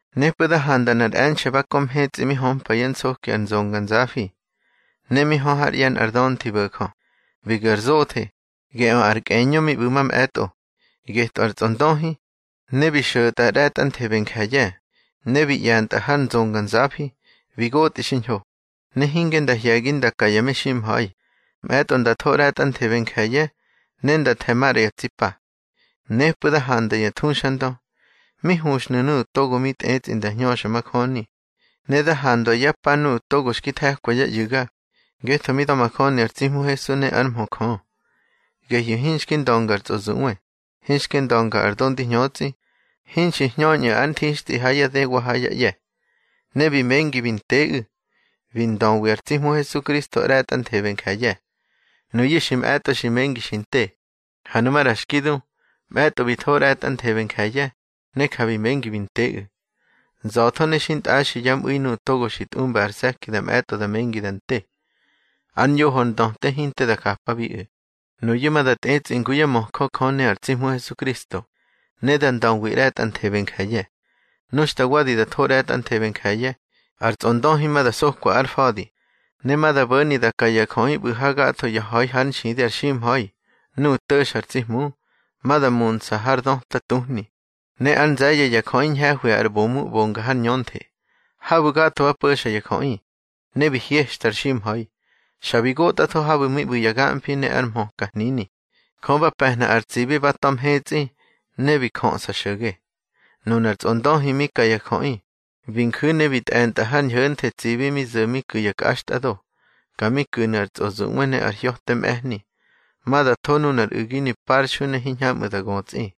Nepꞌu̱ da handa nꞌar e̱nxe̱ ba kö mhetsꞌi mi hömpa yá nsoki ar nzonganzafi, ne mi hö hár ꞌye̱ nꞌar dönthi bo̱jö. Bi gu̱ ar zothe, geꞌö ar kꞌeñö mi ꞌbu̱ mamꞌe̱tꞌo, getꞌö ar tsꞌondöhi, ne bi xo̱tꞌa ꞌre̱tꞌanthebe ya je̱ye̱. Ne bi ꞌye̱ntꞌa har nzonganzafi, bi gotꞌi xiñho, ne hinge nda hye̱gi nda ka ya meximha̱i. Mꞌe̱tꞌo da tho ꞌre̱tꞌanthebe nje̱ye̱, ne da the̱ maꞌra ya tsi pa. Nepꞌu̱ da handa ya thuxandö, mi huxnu̱ nuꞌu̱ togo bi tꞌetsꞌi nda hñöxa majöni. Ne da handwa yá pa nuꞌu̱ togo xki the̱kwa yá ꞌyu̱ga, ngetho mi da̱majöni ar tsi Hmu Hesu ne ár mhö Jö. Gehyu̱ hinxki ndönga ar tsꞌozuꞌwe, hinxki ndönga ar do ndi hñötsꞌi. Hinxi hñöñꞌu̱ ár nthixtꞌi ha yá dë wa ha yá ꞌye̱. Ne bi mengi bi nteꞌu̱, bi ndöwi ar tsi Hmu Hesukristo ꞌre̱tꞌanthebe nje̱ye̱. Nuyu̱ xi mꞌe̱tꞌo xi mengi xi nte. Ha nu maꞌra xki du, mꞌe̱tꞌo bi tho ꞌre̱tꞌanthebe nje̱ye̱, ne ja bi mengi bi nteꞌu̱. Nza̱tho ne xintꞌaxi yá mꞌu̱i nuꞌu̱ togo xi tꞌumba ar se̱ki da mꞌe̱tꞌo da mengi da nte. Ar ñoho ndöte hinte da japabiꞌu̱. Nuyu̱ ma da tꞌetsꞌi ngu yá möjö Jö ne ar tsi Hmu Hesukristo, ne da ndöwi ꞌre̱tꞌanthebe nje̱ye̱. Nu xta wadi da tho ꞌre̱tꞌanthebe nje̱ye̱, ar tsꞌondöhi ma da sokwa ár fa̱di. Ne ma da bo̱ni da ka ya jöꞌi ꞌbu̱ ha gatho ya ha̱i hár nxidi ar ximha̱i, nuꞌu̱ to̱xa ar tsi Hmu. Ma da munsa har döta tuhni, ne ár nze̱ye̱ ya jöꞌi ñhe̱hwi ar ꞌbomu ꞌbonga har ñönthe. Habu̱ gatho ba po̱xa ya jöꞌi, ne bi hyextar ximha̱i, xa bi gotꞌatho habu̱ mi ꞌbu̱ ya gamfi ne ar hmöka hnini. Jö ba pe̱hna ar tsibi ba ta̱ mhetsꞌi, ne bi jöꞌsa xo̱ge. Nunar tsꞌondöhi mi ka ya jöꞌi, bi nju̱ ne bi tꞌe̱ntꞌa har ñho̱nthe tsibi mi zo̱ mi ku̱ ya kꞌaxtꞌado, ka mi ku̱nu̱ ar tsꞌozuꞌwe ne ar hya̱te mꞌe̱hni. Ma da tho nunar u̱ginu̱ parxui ne hiñhamꞌu̱ da götsꞌi.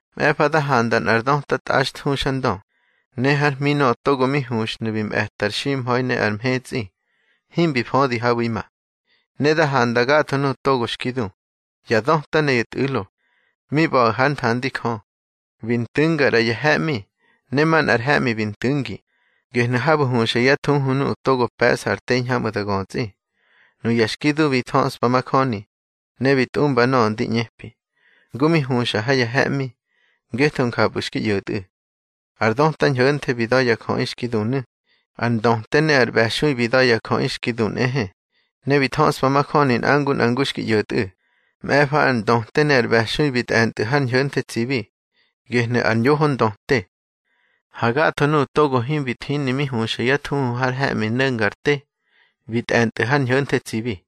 Mꞌe̱fa da handa nꞌar döta tꞌaxthuxandö, ne hár hmi nöꞌö togo mi huxhnu̱ bi mꞌe̱ta ar ximha̱i ne ar mhetsꞌi, himbi födi habu̱ima. Ne da handa gatho nuꞌu̱ togo xki du, ya döta ne ya tꞌu̱lo, mi ꞌba̱ꞌu̱ hár nthandi Jö. Bi ntu̱nga ꞌra ya he̱ꞌmi, ne manꞌar he̱ꞌmi bi ntu̱ngi, gehnu̱ habu̱ huxa yá thuhu nuꞌu̱ togo pe̱ꞌsa ar te hiñhamꞌu̱ da götsꞌi. Nuya xki du bi thöꞌspa majöni, ne bi tꞌumbi nöꞌö ndi ꞌñepi, ngu mi huxa ha ya he̱ꞌmi, ngetho njapꞌu̱ xki ꞌyo̱tꞌu̱. Ar döta ñho̱nthe bi da̱ yá jöꞌi xki dunu̱, ar ndöte ne ar ꞌbe̱xui bi da̱ yá jöꞌi xki du nꞌehe, ne bi thöꞌspa majöni nꞌa ngu nꞌa ngu xki ꞌyo̱tꞌu̱. Mꞌe̱fa ar ndöte ne ar ꞌbe̱xui bi tꞌe̱ntꞌu̱ har ñho̱nthe tsibi. Gehnu̱ ar ñoho ndöte. Ha gatho nuꞌu̱ togo himbi thini mi huxa yá thuhu har he̱ꞌmi no̱nga ar te, bi tꞌe̱ntꞌu̱ har ñho̱nthe tsibi.